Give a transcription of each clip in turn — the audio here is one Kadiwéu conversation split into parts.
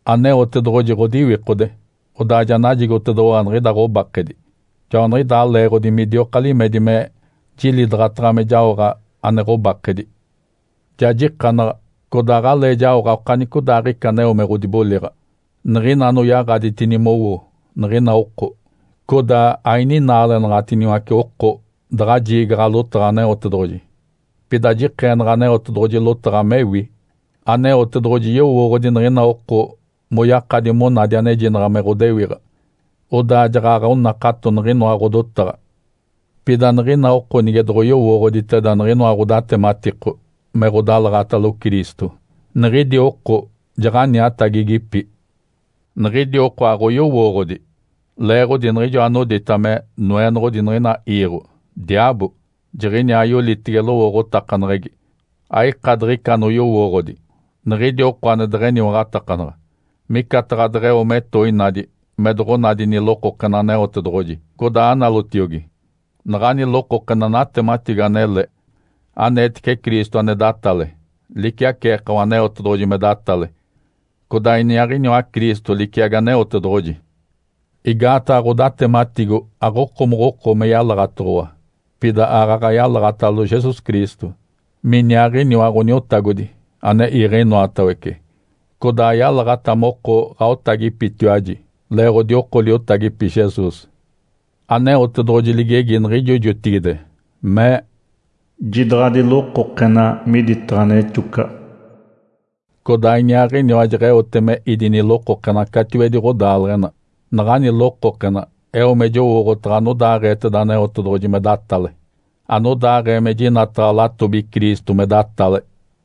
Aneotedoɡ̶oji ɡ̶odiwikode, odaa ja najigotedoɡ̶owa niɡ̶ida ɡ̶obakedi. Joaniɡ̶idaa leeɡ̶odi midioka limedi me jilidaɡ̶ata me jaoɡ̶a ane ɡ̶obakedi. Ja jikanaɡ̶a, codaa aɡ̶alee jaoɡ̶a okanicodaaɡ̶ica aneo me ɡ̶odiboliɡ̶a, niɡ̶ina anoyaɡ̶aditini mowo niɡ̶ina oko. Codaa aininaalenaɡ̶atiniwace oko daɡ̶a jiigaɡ̶a lotaɡ̶a Aneotedoɡ̶oji. Pida jikeenaɡ̶a Aneotedoɡ̶oji lotaɡ̶a mewi. Aneotedoɡ̶oji yowooɡ̶odi niɡ̶ina oko moyakadi monadi anejinaɡ̶a me ɡ̶odewiɡ̶a, odaa jaɡ̶aɡ̶a onakato niɡ̶inoa ɡ̶odotaɡ̶a. Pida niɡ̶ina oko nige doɡ̶oyowooɡ̶oditeda niɡ̶inoa ɡ̶odatematiko me ɡ̶odalaɡ̶atalo Cristo, niɡ̶idi oko jaɡ̶aniatagigipi. Niɡ̶idi oko aɡ̶oyowooɡ̶odi, leeɡ̶odi niɡ̶ijo anodita me, “noenoɡ̶odi niɡ̶ina iiɡ̶o”, diaabo, jiɡ̶iniaa yolitege lowooɡ̶otakaneɡ̶egi, aika diɡ̶ica anoyowooɡ̶odi, niɡ̶idi oko ane deɡ̶eniwaɡ̶atakanaɡ̶a. Micataɡ̶a deɡ̶eo metoinadi me doɡ̶onadi nilokokena Aneotedoɡ̶oji, codaa analotiogi. Naɡ̶ani lokokena natematigo anele, aneetece Cristo ane datale liciaceekawa Aneotedoɡ̶oji me datale, codaa Iniaaɡ̶iniwa Cristo liciagi Aneotedoɡ̶oji. Igaataɡ̶a ɡ̶odatematigo aɡ̶okomokoko me yalaɡ̶atoɡ̶owa, pida aaɡ̶aɡ̶a yalaɡ̶atalo Jesus Cristo, miniaaɡ̶iniwa Ǥoniotagodi ane iiɡ̶e inoatawece, codaa yalaɡ̶ata moko ɡ̶aotagipitiwaji leeɡ̶odi oko liotagipi Jesus. Aneotedoɡ̶oji ligegi niɡ̶ijo jotigide, mee, “Jidaɡ̶adi lokokena miditaɡ̶a nexocaɡ̶a!” Codaa Iniaaɡ̶iniwa jeɡ̶eote me ídi nilokokena catiwedi ɡ̶odaaleɡ̶ena. Naɡ̶ani lokokena eo me jowooɡ̶otaɡ̶a anodaaɡ̶eeteda Aneotedoɡ̶oji me datale, anodaaɡ̶ee me jinataɡ̶a latobi Cristo me datale.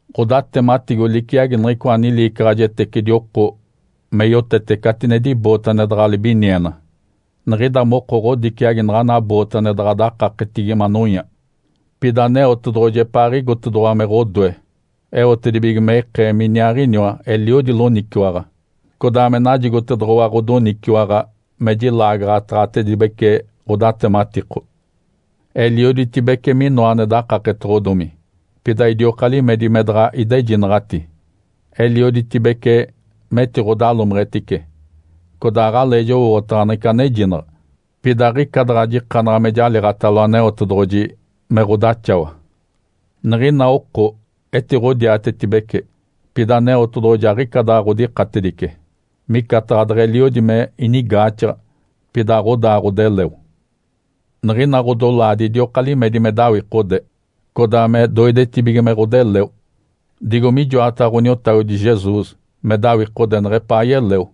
Ǥodatematigo liciagi niɡ̶icoa niliicaɡ̶ajetecidi oko me yotete catinedi boote ane daɡ̶a libiniena. Niɡ̶ida moko ɡ̶odiciagi naɡ̶ana boote ane daɡ̶a dakaketigi manonya. Pida Aneotedoɡ̶oji epaaɡ̶igotedoɡ̶owa me ɡ̶odoe eotedibige me ikee miniaaɡ̶iniwa eliodi loniciwaɡ̶a, codaa me najigotedoɡ̶owa ɡ̶odoniciwaɡ̶a me jilaagaɡ̶ataɡ̶atedibece ɡ̶odatematiko. Elioditibece minoa ane dakaketoɡ̶odomi, pida idioka limedi me daɡ̶a idejinaɡ̶ati. Elioditibece metiɡ̶odalomeɡ̶etice, codaa aɡ̶alee jowooɡ̶otaɡ̶a niɡ̶ica anejinaɡ̶a, pida aɡ̶ica daɡ̶a jikanaɡ̶a me jaliiɡ̶atalo Aneotedoɡ̶oji me ɡ̶odaxawa. Niɡ̶ina oko etiɡ̶odiatetibece, pida Aneotedoɡ̶oji aɡ̶ica daɡ̶a ɡ̶odikatedice. Micataɡ̶a deɡ̶eliodi me inigaaxaɡ̶a, pida aɡ̶odaa ɡ̶odeleo. Niɡ̶ina ɡ̶odolaadi idioka limedi me dawikode, codaa me doidetibige me ɡ̶odeleo, digo mijoataɡ̶a Ǥoniotagodi Jesus me dawikode neɡ̶epaa yeleo.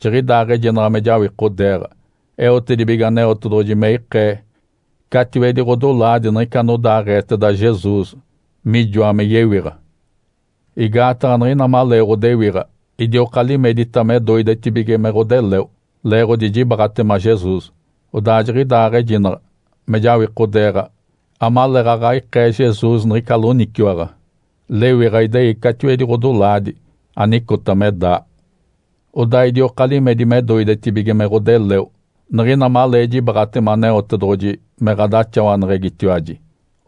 Jiɡ̶idaaɡ̶ejinaɡ̶a me jawikodeeɡ̶a eotedibige Aneotedoɡ̶oji me ikee catiwedi ɡ̶odolaadi niɡ̶ica anodaaɡ̶eeteda Jesus mijoa me yewiɡ̶a. Igaataɡ̶a niɡ̶ina malee ɡ̶odewiɡ̶a idioka limedita me doidetibige me ɡ̶odeleo leeɡ̶odi jibaaɡ̶atema Jesus. Odaa jiɡ̶idaaɡ̶ejinaɡ̶a me jawikodeeɡ̶a amaleeɡ̶aɡ̶a ikee Jesus niɡ̶ica loniciwaɡ̶a lewiɡ̶a idei catiwedi ɡ̶odolaadi anicota me daa. Odaa idioka limedi me doidetibige me ɡ̶odeleo niɡ̶ina malee jibaaɡ̶atema Aneotedoɡ̶oji me ɡ̶adaxawaneɡ̶egitiwaji.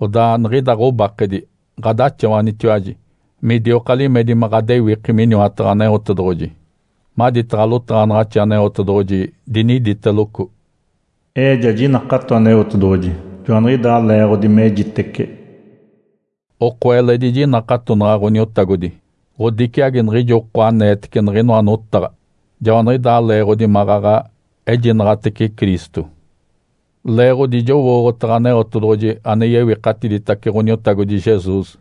Odaa niɡ̶ida ɡ̶obakedi ɡ̶adaxawanitiwaji midioka limedi me ɡ̶adewiki miniwataɡ̶a Aneotedoɡ̶oji. Maditaɡ̶a lotaɡ̶anaɡ̶axi Aneotedoɡ̶oji diniditeloco, “Ee ja jinakato Aneotedoɡ̶oji, joaniɡ̶idaa leeɡ̶odi mejitece.” Oko eledi jinakatonaɡ̶a Ǥoniotagodi, ɡ̶odiciagi niɡ̶ijo oko aneetece niɡ̶inoa notaɡ̶a. Joaniɡ̶idaa leeɡ̶odi maɡ̶aɡ̶a ejinaɡ̶atece Cristo. Leeɡ̶odi jowooɡ̶otaɡ̶a Aneotedoɡ̶oji ane yewikatiditace Ǥoniotagodi Jesus,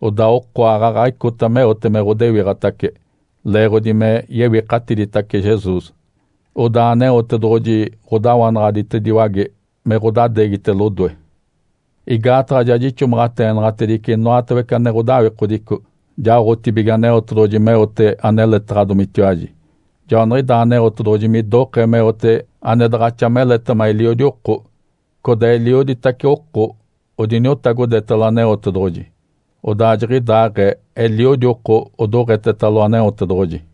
odaa oko aaɡ̶aɡ̶a icota meote me ɡ̶odewiɡ̶atace leeɡ̶odi me yewikatiditace Jesus. Odaa Aneotedoɡ̶oji ɡ̶odawanaɡ̶aditediwage me ɡ̶odadeegite lodoe. Igaataɡ̶a ja jixomaɡ̶ateenaɡ̶atedice inoatawece ane ɡ̶odawikodico jaoɡ̶atibige Aneotedoɡ̶oji meote aneletaɡ̶adomitiwaji. Joaniɡ̶idaa Aneotedoɡ̶oji midokee meote ane daɡ̶axa meletema eliodi oko. Codaa elioditace oko odiniotagodetalo Aneotedoɡ̶oji, odaa jiɡ̶idaaɡ̶ee eliodi oko odoɡ̶etetalo Aneotedoɡ̶oji.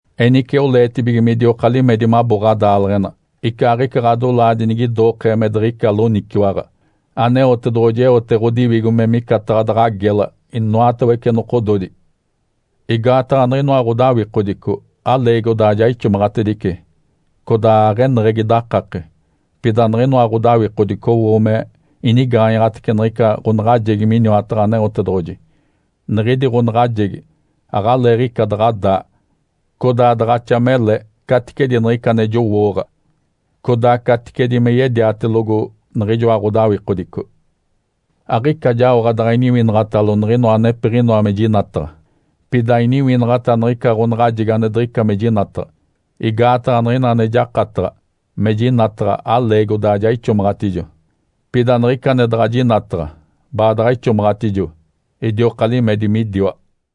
Enice oleetibige midioka limedi mabo ɡ̶adaaleɡ̶ena. Icaaɡ̶ica ɡ̶odolaadi nigidokee me diɡ̶ica loniciwaɡ̶a, Aneotedoɡ̶oji eote ɡ̶odiwigo me micataɡ̶a daɡ̶a gela inoatawece nokododi. Igaataɡ̶a niɡ̶inoa ɡ̶odawikodico aleegi odaa ja ixomaɡ̶atedice, codaa aɡ̶eneɡ̶egi dakake. Pida niɡ̶inoa ɡ̶odawikodico owo me inigaanyaɡ̶atece niɡ̶ica ɡ̶onaɡ̶ajegi miniwataɡ̶a Aneotedoɡ̶oji. Niɡ̶idi ɡ̶onaɡ̶ajegi aɡ̶aleeɡ̶ica daɡ̶a daa, codaa daɡ̶axa mele caticedi niɡ̶ica ane jowooɡ̶a, codaa caticedi me yediatelogo niɡ̶ijoa ɡ̶odawikodico. Aɡ̶ica jaoɡ̶a daɡ̶a iniwinaɡ̶atalo niɡ̶inoa anepiɡ̶inoa me jinataɡ̶a, pida iniwinaɡ̶ata niɡ̶ica ɡ̶onaɡ̶ajegi ane diɡ̶ica me jinataɡ̶a. Igaataɡ̶a niɡ̶ina ane jakataɡ̶a me jinataɡ̶a aleegi odaa ja ixomaɡ̶atijo, pida niɡ̶ica ane daɡ̶a jinataɡ̶a baadaɡ̶a ixomaɡ̶atedijo, idioka limedi midiwa.